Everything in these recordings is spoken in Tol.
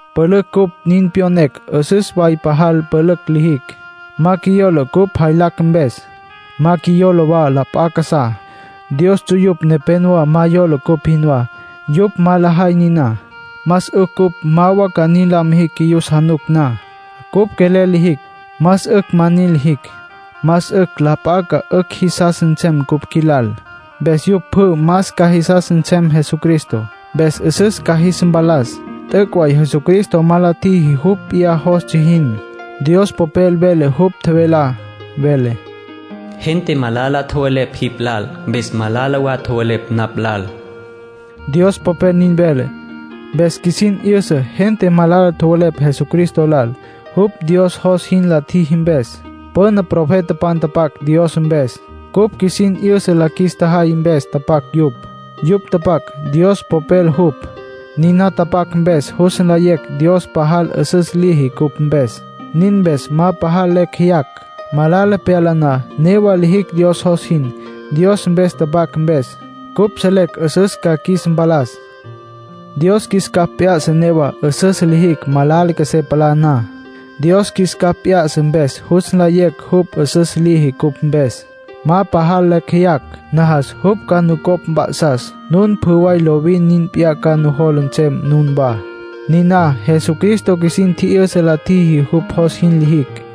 Pülücj cupj nin pyonecj 'üsüs way pajal pülücj lijicj. Ma qjuiyola cupj lyajacj mpes. Ma qjuiyola wa la p'a casá. Dios ts'uyupj nepénowa ma yola cupj jinwá. Yupj ma lajay niná, más 'ücj cupj ma wa ca nin la mijicj qjuiyus januc na. Cupj quelel lijicj, más 'ücj ma nin lijicj. Más 'ücj la p'a ca 'ücj jisas nsem cupj qjuilal. Mpes yupj pjü más ca jisas nsem Jesucristo. Mpes 'üsüs ca jis mpalas. T'üc' way Jesucristo ma la tjiji jupj p'iyá jostsja jin. Dios Popel vele jupj tjevelá. Vele: “Gente malala tjowelepj jipj lal. Mpes malala wa tjowelepj napj lal”, Dios Popel nin vele. Mpes qjuisin 'yüsa gente malala tjowelepj Jesucristo lal, jupj Dios jos jin la tjiji mpes. Püna profetapan tapac Dios mpes, cupj qjuisin 'yüsa la qjuis tjajay mpes tapac yupj. Yupj tapac, Dios Popel jupj. Niná tapac mpes jus nlayecj Dios pajal 'üsüs liji cupj mpes. Nin mpes ma pajal lecj jeyacj. Malala pyala na, newa lijicj Dios jos jin. Dios mpes tapac mpes, cupj selecj 'üsüs ca qjuis mpalas. Dios qjuis capj p'ya'sa newa 'üsüs lijicj malala qjuesé palá na. Dios qjuis capj p'ya'sa mpes jus nlayecj jupj 'üsüs liji cupj mpes. Ma pajal lecj jeyacj. Najas jupj ca nucopj mp'a'sas nun pjü way lovin nin p'iyá ca nujola nsem nunwá. Niná Jesucristo qjuisin tji'yüsa la tjiji jupj jos nin lijicj.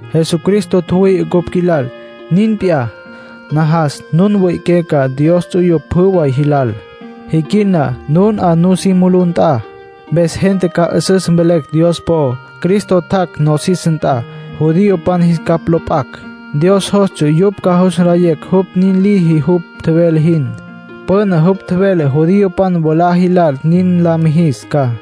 Jesucristo tjüwüi'i cupj qjuilal. Nin p'iyá, najas nun mwi'iqué ca Dios ts'uyupj pjü way jilal, jiquil na nun 'a nusí mulú nt'a. Mpes gente ca 'üsüs mvelecj Dios po'ó. Cristo tjac' nosis nt'a, judiopan jis capj lo p'acj. Dios jostsja yupj ca jus nlayecj jupj nin liji jupj tjevele jin. Püna jupj tjevele judiopan mwalá jilal nin la mijis ca.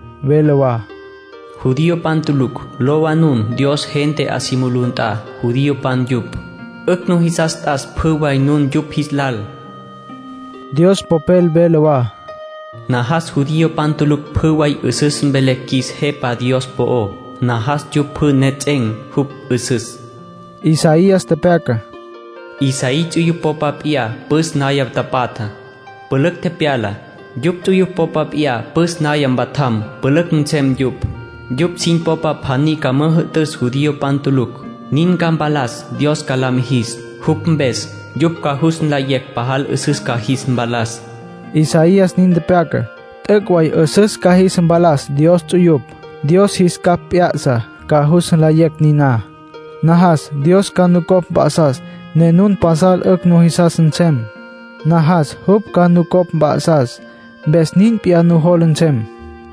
Vele wa: “Judiopan tulucj, lowa nun Dios gente 'a si mulú nt'a, judiopan yupj. 'Ücj nujisas t'as pjü way nun yupj jis lal.” Dios Popel vele wa: “Najas judiopan tulucj pjü way 'üsüs mvelecj qjuis Jepa Dios po'ó. Najas yupj pjü nejets'en̈ jupj 'üsüs.” Isaías tepyaca: “Isaí ts'uyupj popa p'iyá püs naya tapatja, pülücj tepyala. Yupj ts'uyupj popa p'iyá püs naya mpatjam, pülücj nsem yupj. Yupj sin popa pjaní ca müjü'tüs judiopan tulucj, nin ca mpalas Dios ca la mijis. Jupj mpes yupj ca jus nlayecj pajal 'üsüs ca jis mpalas”, Isaías nin tepyaca. T'üc' way 'üsüs ca jis mpalas Dios ts'uyupj. Dios jis capj p'ya'sa ca jus nlayecj niná. Najas Dios ca nucopj mp'a'sas ne nun pasal 'ücj nujisas nsem. Najas jupj ca nucopj mp'a'sas, mpes nin p'iyá nujola nsem.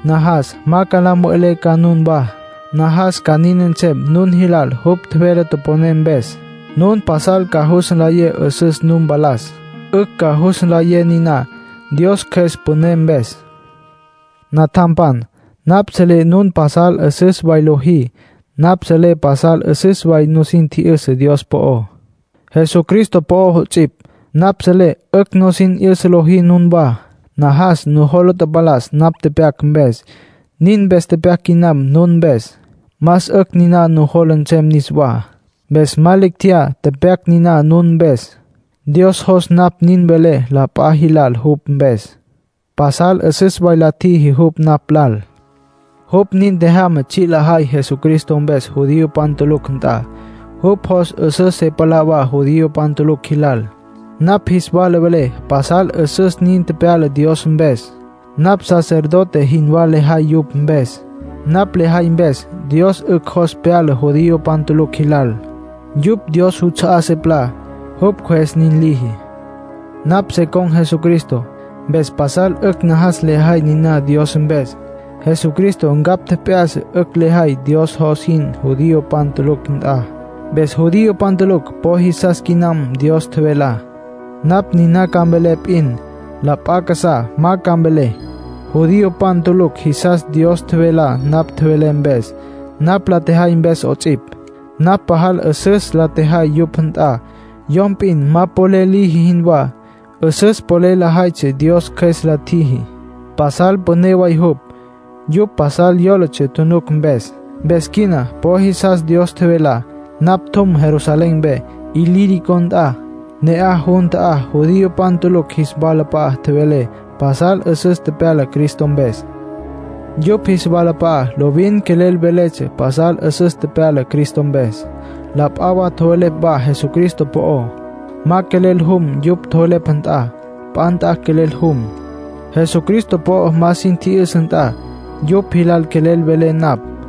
Najas ma la mve'lé ca nunwá. Najas ca nin nsem nun jilal jupj tjevele toponé mpes. Nun pasal ca jus nlayé 'üsüs nu mpalas. 'Ücj ca jus nlayé niná, Dios Cjües püné mpes. Natjampan, napj selé nun pasal 'üsüs way lojí. Napj selé pasal 'üsüs nusin tji'yüsa Dios po'ó, Jesucristo po'ó 'ots'ipj. Napj selé 'ücj sin 'yüsa lojí nunwá. Najas nujola mpalas napj tepyac mpes, nin mpes pyac quinam nun mpes. Más 'ücj niná nujola nsem niswá, mpes ma lecj tjeyá tepyac niná nun mpes. Dios jos napj nin velé la p'a jilal jupj mpes. Pasal 'üsüs way la tjiji jupj napj lal. Jupj nin tjejyama tsji' lejay Jesucristo mpes judiopan tulucj nt'a. Jupj jos 'üsüs se palá wa judiopan tulucj jilal. Napj jis wala velé pasal 'üsüs nin tepyala Dios mpes. Napj sacerdote jinwá lejay yupj mpes. Napj lejay mpes, Dios 'ücj jos pyala judiopan tulucj jilal. Yupj Dios juts'a'á se palá, jupj Cjües nin liji. Napj se con̈ Jesucristo, mpes pasal 'ücj najas lejay niná Dios mpes. Jesucristo ncapj tjep'ya'sa 'ücj lejay Dios jos jin judiopan tulucj nt'a. Mpes judiopan tulucj po jisas quinam Dios tjevelá. Napj niná ca mvelé p'in, la p'a casá ma ca mvelé. Judiopan tulucj jisas Dios tjevelá napj tjevelé mpes, napj la tjejay mpes 'ots'ipj. Napj pajal 'üsüs la tjejay yupj nt'a, yom p'in ma polel liji jinwá. 'Üsüs polel lejaytsja Dios Cjües la tjiji; pasal püné way jupj. Yupj pasal yólatsja tjunuc mpes. Mpes quina po jisas Dios tjevelá. Napj tjum Jerusalén mpe Ilírico nt'a, ne'aj jun ta'á judiopan tulucj jis walap'a'a tjevelé pasal 'üsüs tepyala Cristo mpes. Yupj jis walap'a'a lovin quelel veletsja pasal 'üsüs tepyala Cristo mpes. La p'a wa tjowelepj wa Jesucristo po'ó. Ma quelel jum yupj tjowelepj nt'a. P'a nt'a quelel jum. Jesucristo po'o ma sin tji'yüsa nt'a, yupj jilal quelel velé napj.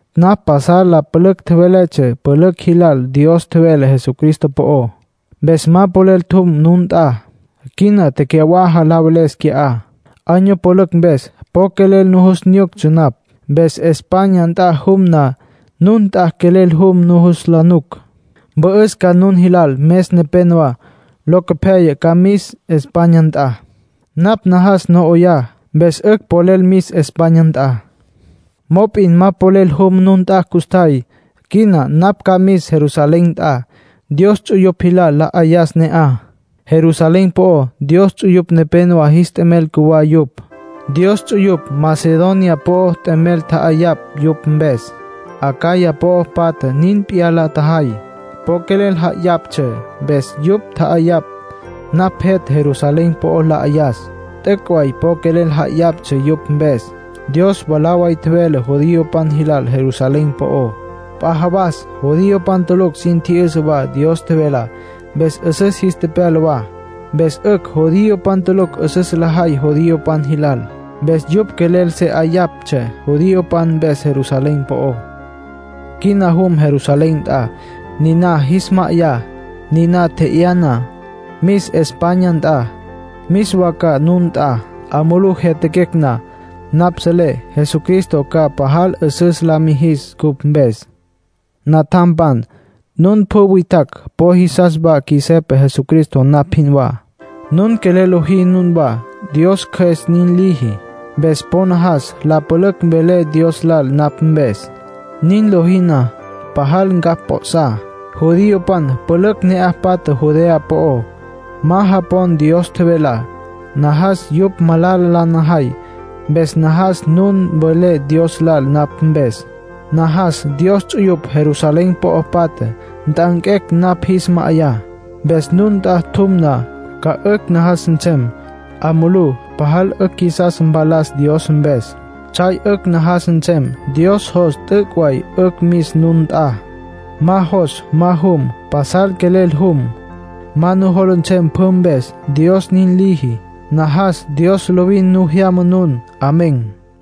Napj pasal la pülücj tjeveletsja pülücj jilal Dios tjevelá Jesucristo po'ó. Mpes ma polel tjum nun nt'a. Quina tecyawaja la veles qui'á. Año pülücj mpes po quelel nujus nyuctsja napj. Mpes España nt'a jum na, nun nt'a quelel jum nujus la nuc. Mpü'üs ca nun jilal mes nepénowa. Locopyaya ca mis España nt'a. Napj najas no 'oyá, mpes 'ücj polel mis España nt'a. Mop'in ma polel jum nun nt'a custjay. Quina napj ca mis Jerusalén nt'a, Dios ts'uyupj jilal la 'ayas ne'aj. Jerusalén po'ó Dios ts'uyupj nepénowa jis t'emel cjuwá yupj. Dios ts'uyupj Macedonia po'ó t'emel tja'ayapj yupj mpes. Acaya po'o patja nin p'iyá la tjajay. Po quelel ja'ayaptsja. Mpes yupj tja'ayapj, napj jet' Jerusalén po'ó la 'ayas. T'üc' way po quelel ja'ayaptsja yupj mpes. Dios mwalá way tjevele judiopan jilal Jerusalén po'ó. P'a jawas judiopan tulucj sin tji'yüsa wa Dios tjevelá, mpes 'üsüs jis tepyala wa. Mpes 'ücj judiopan tulucj 'üsüs lajay judiopan jilal. Mpes yupj quelel se 'ayaptsja judiopan mpes Jerusalén po'ó. Quina jum Jerusalén nt'a, niná jis ma'ayá. Niná tje'yá na, mis España nt'a. Mis wa ca nun nt'a. 'A mulú jyatjaquecj na, napj selé Jesucristo ca pajal 'üsüs la mijis cupj mpes. Natjampan, nun pjü witjacj po jisas wa qjuis Jepa Jesucristo, napj jinwá. Nun quelel lojí nunwá, Dios Cjües nin liji. Mpes po najas la pülücj welé Dios lal napj mpes. Nin lojí na, pajal ncapj p'o'sá. Judiopan pülücj ne'aj patja Judea po'ó, ma japon Dios tjevelá. Najas yupj ma malala la najay. Mpes najas nun nin welé Dios lal napj mpes. Najas Dios ts'uyupj Jerusalén po'o patja nt'anquecj napj jis ma'ayá. Mpes nun nt'a tjum na, ca 'ücj najas nsem. 'A mulú pajal 'ücj qjuisas mpalas Dios mpes. Tsjay 'ücj najas nsem. Dios jos, t'üc' way 'ücj mis nun nt'a. Ma jos, ma jum. Pasal quelel jum. Ma nujola nsem pjü mpes, Dios nin liji. Najas Dios lovin nu jyama nun. Amén.